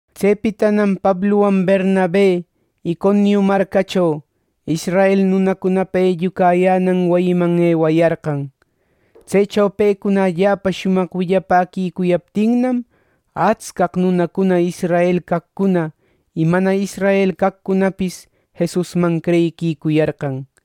Tsepitanam Pabluwan Bernabe Iconiu marcacho, israel nunacunapa ellucayänan wayiman ewayarqan. Tsecho pecuna allapa shumaq willapäquicuyaptinnam, atscaq nunacuna israel caqcuna y mana israel caqcunapis Jesusman creyiquicuyarqan.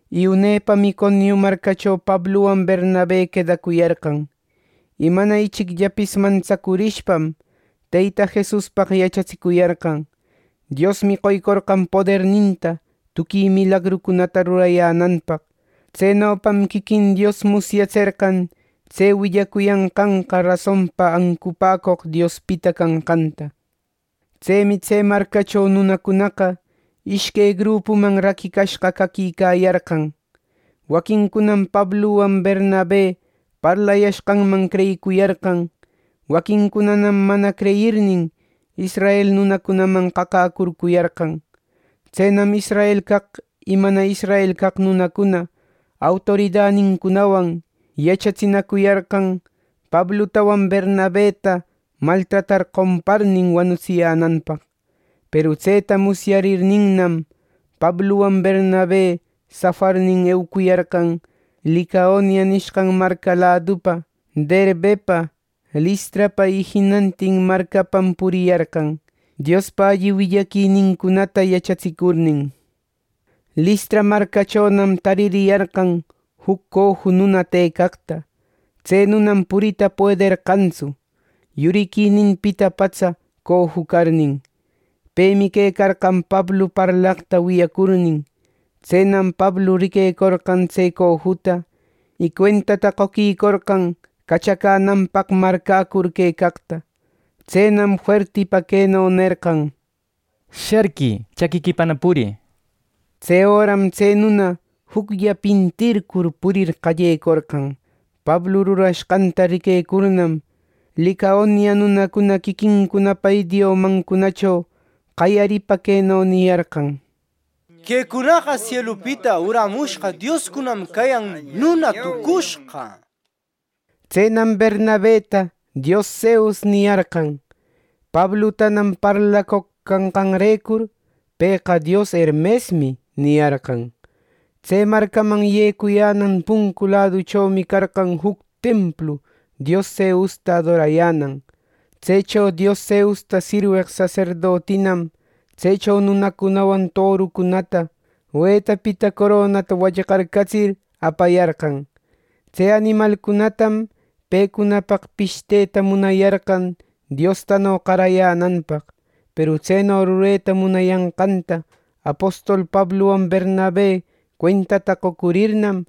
Y unepam Iconiu marcacho Pabluwan Bernabe quedacuyarqan. Y mana ichicllapis mantsacurishpam, Teyta Jesuspaq yachatsicuyarqan. Diosmi qoycorqan poderninta tuqui milagrucunata rurayänanpaq. Tsenopam quiquin Dios musyatserqan tse willacuyanqanqa rasonpa ancupäcoq Diospita canqanta. Tsemi tse marcacho nunacunaqa ishque grupuman raquicashqa caquicayarqan. Waquincunam Pabluwan Bernabe parlayashqanman creyicuyarqan. Waquincunanam mana creyirnin, israel nunacunaman qaqäcurcuyarqan. Tsenam israel caq y mana israel caq nunacuna autoridanincunawan yachatsinacuyarqan, Pablutawan Bernabeta maltratar qomparnin, wanutsiyänanpaq. Peru tseta musyarirninnam, Pabluwan Bernabe safarnin eucuyarqan Licaonia nishqan marca ladupa, Derbepa, Listrapa y jinantin marcapam puriyarqan, Diospa alli willaquinincunata yachatsicurnin. Listra marcachonam taririyarqan juc coju nuna tëcaqta. Tse nunam purita puederqantsu, yuriquininpita patsa coju carnin. Pemi quecarqan Pablu parlaqta wiyacurnin. Tsenam Pablu riquecorqan tse cojuta, y cuentata qoquicorqan cachacänanpaq marcäcur quecaqta. Tsenam fuertipa queno nerqan: —¡Sharquï! ¡Chaquiquipana purï! —nishpa. Tse öram tse nuna juclla pintircur, purir qallecorqan. Pablu rurashqanta riquecurnam, Licaonia nunacuna quiquincunapa idiomancunacho qayaripa queno niyarqan: —¡Quecunaqa sielupita urämushqa dioscunam cayan nuna tucushqa! —nishpa. Tsenam Bernabeta “dios Zeus” niyarqan; Pablutanam parlacoq canqanrecur, “pëqa dios Hermesmi” niyarqan. Tse marcaman yecuyänan puncu laduchomi carqan juc templu dios Zeusta adorayänan. Tsecho dios Zeus sirweq saserdotinam tsecho nunacunawan torucunata wetapita coronata wallqarcatsir, apayarqan. Tse animalcunatam pecunapaq pishteta munayarqan diostano qarayänanpaq. Peru tseno rureta munayanqanta apostol Pabluwan Bernabe cuentata qocurirnam,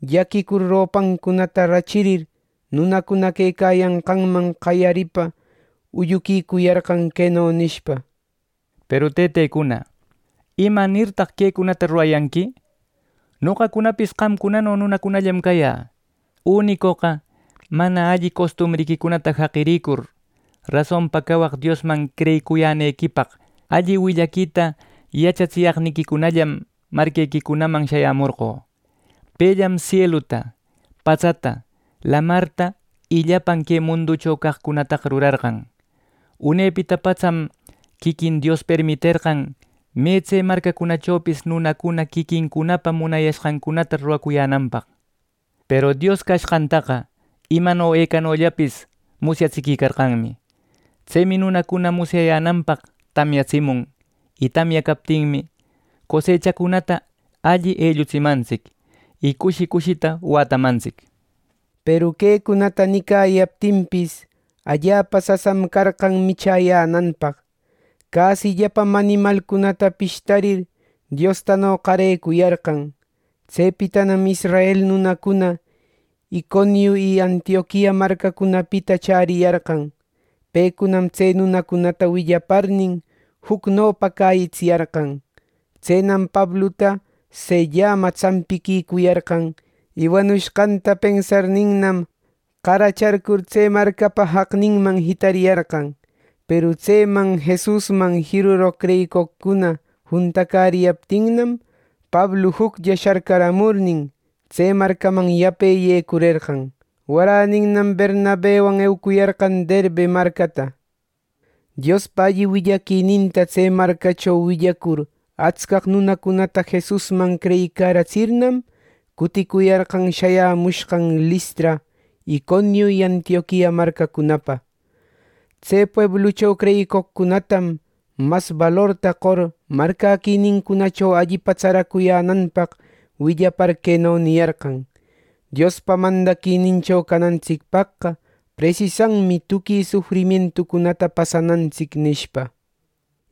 llaquicur ropancunata rachirir, nunacuna quecayanqanman qayaripa ulluquicuyarqan, queno nishpa: —Peru tëtecuna, ¿imanirtaq quecunata rurayanqui? Noqacunapis qamcunano nunallam cayä. Unicoqa mana alli costumbriquicunata jaqirïcur, rasonpa cawaq Diosman creyicuyänequipaq alli willaquita yachatsiyaqniquicunallam marquequicunaman shayämorqö. Pellam sieluta, patsata, lamarta y llapan que munducho caqcunataqa rurarqan. Unepita patsam quiquin Dios permiterqan me tse marcachopis nunacuna quiquincunapa munayashqancunata ruracuyänanpaq. Peru Dios cashqantaqa imano ecanollapis musyatsiquicarqanmi. Tsemi nunacuna musyayänanpaq tamyatsimun; y tamya captinmi, cosechacunata alli ellutsimantsic; y cushi cushita wätamantsic —nishpa. Peru quecunata nicayaptinpis, allapa sasam carqan michäyänanpaq. Cäsillapam animalcunata pishtarir Diostano qarecuyarqan. Tsepitanam israel nunacuna Iconiu y Antioquia marcacunapita chäriyarqan. Pecunam tse nunacunata willaparnin, jucnopa cäyitsiyarqan. Tsenam Pabluta sellama tsampiquicuyarqan. Y wanushqanta pensarninnam, qaracharcur tse marcapa jaqninman jitariyarqan. Peru tseman Jesusman jiruroq creyicoqcuna juntacäriyaptinnam, Pablu juclla sharcaramurnin, tse marcaman yape yecurerqan. Waräninnam Bernabewan eucuyarqan Derbe marcata. Diospa alli willaquininta tse marcacho willacur atscaq nunacunata Jesusman creyicaratsirnam, cuticuyarqan shayamushqan Listra, Iconiu y Antioquia marcacunapa. Tse pueblucho creyicoqcunatam mas balorta qor marcäquinincunacho allipa tsaracuyänanpaq willapar queno niyarqan: —Diospa mandaquinincho canantsicpaqqa presisanmi tuqui sufrimientucunata pasanantsic —nishpa.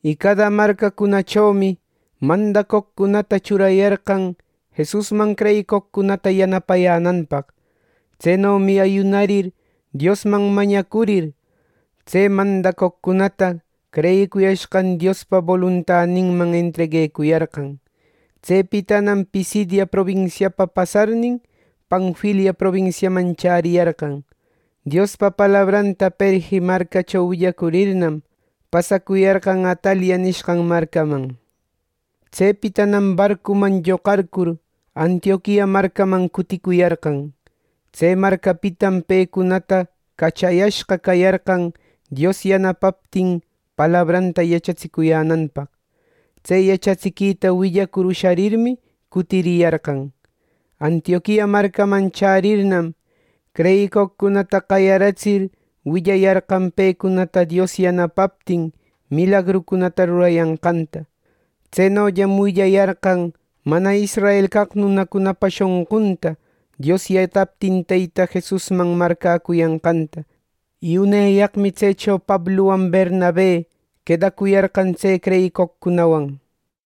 Y cada marcacunachomi mandacoqcunata churayarqan Jesusman creyicoqcunata yanapayänanpaq. Tsenomi ayunarir Diosman mañacurir, tse mandacoqcunata creyicuyashqan Diospa boluntaninman entreguecuyarqan. Tsepitanam Pisidia probinsiapa pasarnin, Panfilia probinsiaman chäriyarqan. Diospa palabranta Perge marcacho willacurirnam, pasacuyarqan Atalia nishqan marcaman. Tsepitanam barcuman lloqarcur Antioquia marcaman cuticuyarqan. Tse marcapitam pecunata cachayashqa cayarqan Dios yanapaptin palabranta yachatsicuyänanpaq. Tse yachatsiquita willacur usharirmi cutiriyarqan. Antioquia marcaman chärirnam, creyicoqcunata qayaratsir willayarqan pecunata Dios yanapaptin milagrucunata rurayanqanta. Tsenollam willayarqan mana israel caq nunacunapa shonqunta Dios yataptin Teyta Jesusman marcäcuyanqanta. Y uneyaqmi tsecho Pabluwan Bernabe quedacuyarqan tse creyicoqcunawan.